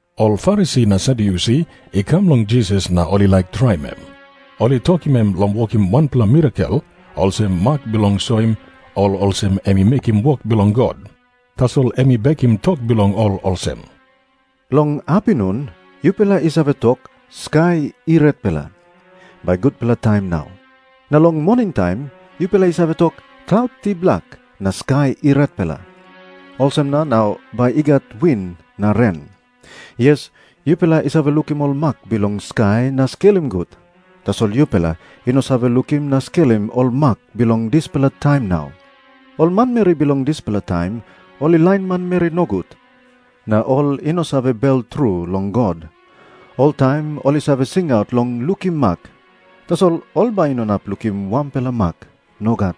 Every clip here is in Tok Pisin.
Ol Farisi na Sadyusi i kam long Jisas na ol i laik traim em. Ol i tokim em long wokim wanpela mirakel olsem mak bilong soim ol olsem em i mekim wok bilong God. Tasol em i bekim tok bilong ol olsem, “Long apinun yupela i save tok, ‘Skai i retpela. Bai gutpela taim nau.’ Na long moningtaim yupela i save tok, ‘Klaut i blak na skai i retpela. Olsem na nau bai i gat win na ren.’ Yes, yupela i save lukim ol mak bilong skai na skelim gut. Tasol yupela i no save lukim na skelim ol mak bilong dispela taim nau. Ol manmeri bilong dispela taim ol i lain manmeri nogut na ol i no save bel tru long God. Oltaim ol i save singaut long lukim mak. Tasol ol bai i no inap lukim wanpela mak. Nogat.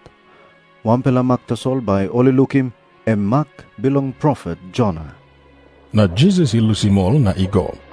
Wanpela mak tasol bai ol i lukim, em mak bilong profet Jona.” Na Jisas i lusim ol na i go.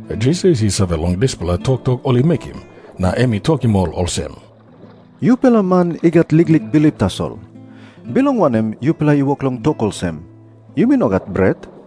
Jisas i save long dispela toktok ol i mekim, na em i tokim ol olsem, “Yupela man i gat liklik bilip tasol. Bilong wanem yupela i wok long tok olsem, ‘Yumi no gat bret’?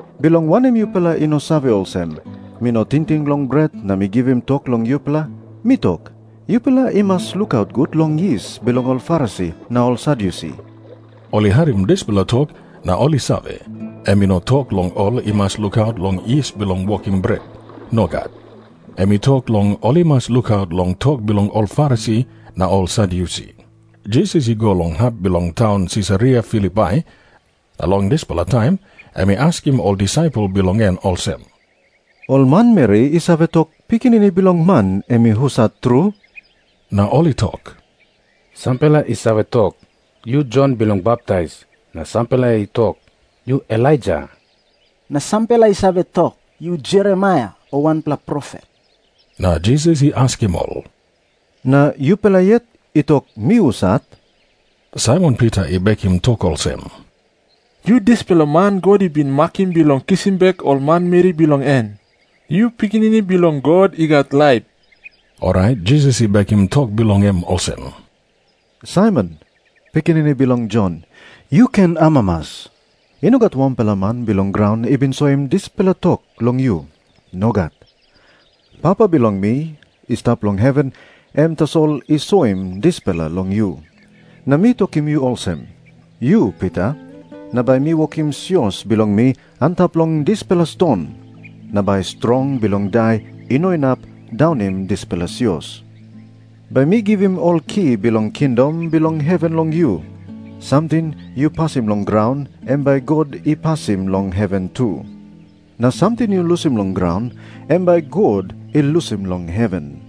Bilong wanem yupela i no save olsem, mi no tingting long bret na mi givim tok long yupela? Mi tok, yupela i mas lukaut gut long yis bilong ol Farisi na ol Sadyusi.” Ol i harim dispela tok na ol i save, em i no tok long ol i mas lukaut long yis bilong wokim bret. Nogat. Em i tok long ol i mas lukaut long tok bilong ol Farisi na ol Sadyusi. Jisas i go long hap bilong taun Sisaria Filipai, na long dispela taim em i askim ol disaipel bilong en olsem, “Ol manmeri i save tok Pikinini Bilong Man em i husat tru?” Na ol i tok, “Sampela i save tok, yu Jon Bilong Baptais. Na sampela i tok, yu Elaija. Na sampela i save tok, yu Jeremaia o wanpela profet.” Na Jisas i askim ol, “Na yupela yet i tok mi husat?” Saimon Pita i bekim tok olsem, “Yu dispela man God i bin makim bilong kisim bek ol manmeri bilong en. Yu Pikinini Bilong God i gat laip.” Orait Jisas i bekim tok bilong em olsem, “Saimon, pikinini bilong Jon, yu ken amamas. I no gat wanpela man bilong graun i bin soim dispela tok long yu. Nogat. Papa bilong mi i stap long heven em tasol i soim dispela long yu. Na mi tokim yu olsem. Yu Pita, na bai mi wokim sios bilong mi antap long dispela ston. Na bai strong bilong Dai i no inap daunim dispela sios. Bai mi givim ol ki bilong kingdom bilong heven long yu. Samting yu pasim long graun, em bai God i pasim long heven tu. Na samting yu lusim long graun, em bai God i lusim long heven.”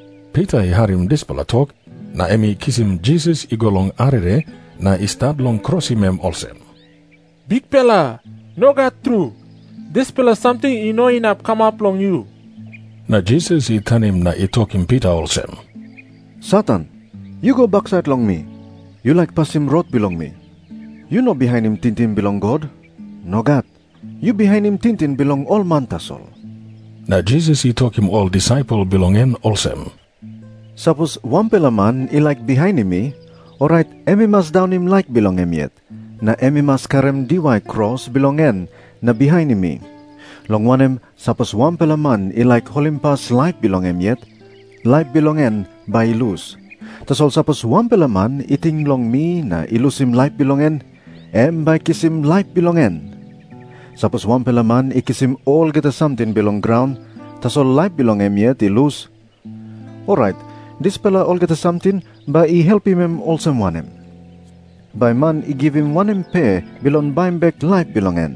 Pita i harim dispela tok na em i kisim Jisas i go long arere na i stat long krosim em olsem, “Bikpela, nogat tru. Dispela samting i no inap kamap long yu.” Na Jisas i tanim na i tokim Pita olsem, “Satan, yu go baksait long mi. Yu laik pasim rot bilong mi. Yu no bihainim tingting bilong God. Nogat. Yu bihainim tingting bilong ol man tasol.” Na Jisas i tokim ol disaipel bilong en olsem, “Sapos wanpela man i laik bihainim mi, orait em i mas daunim laik bilong em yet, na em i mas karim diwai kros bilong en na bihainim mi. Long wanem, sapos wanpela man i laik holimpas laip bilong em yet, laip bilong en bai i lus. Tasol sapos wanpela man i ting long mi na i lusim laip bilong en, em bai i kisim laip bilong en. Sapos wanpela man i kisim olgeta samting bilong graun, tasol laip bilong em yet i lus, orait dispela olgeta samting bai i helpim em olsem wanem? Bai man i givim wanem pe bilong baim bek laip bilong en?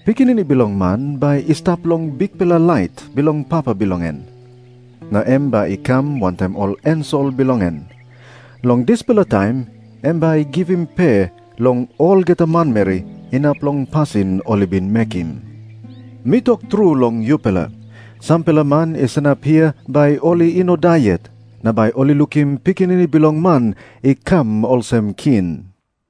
Pikinini Bilong Man bai i stap long bikpela lait bilong Papa bilong en, na em bai i kam wantaim ol ensel bilong en. Long dispela taim em bai i givim pe long olgeta manmeri inap long pasin ol i bin mekim. Mi tok tru long yupela, sampela man i sanap hia bai ol i no i dai yet, na bai ol i lukim Pikinini Bilong Man i kam olsem king.”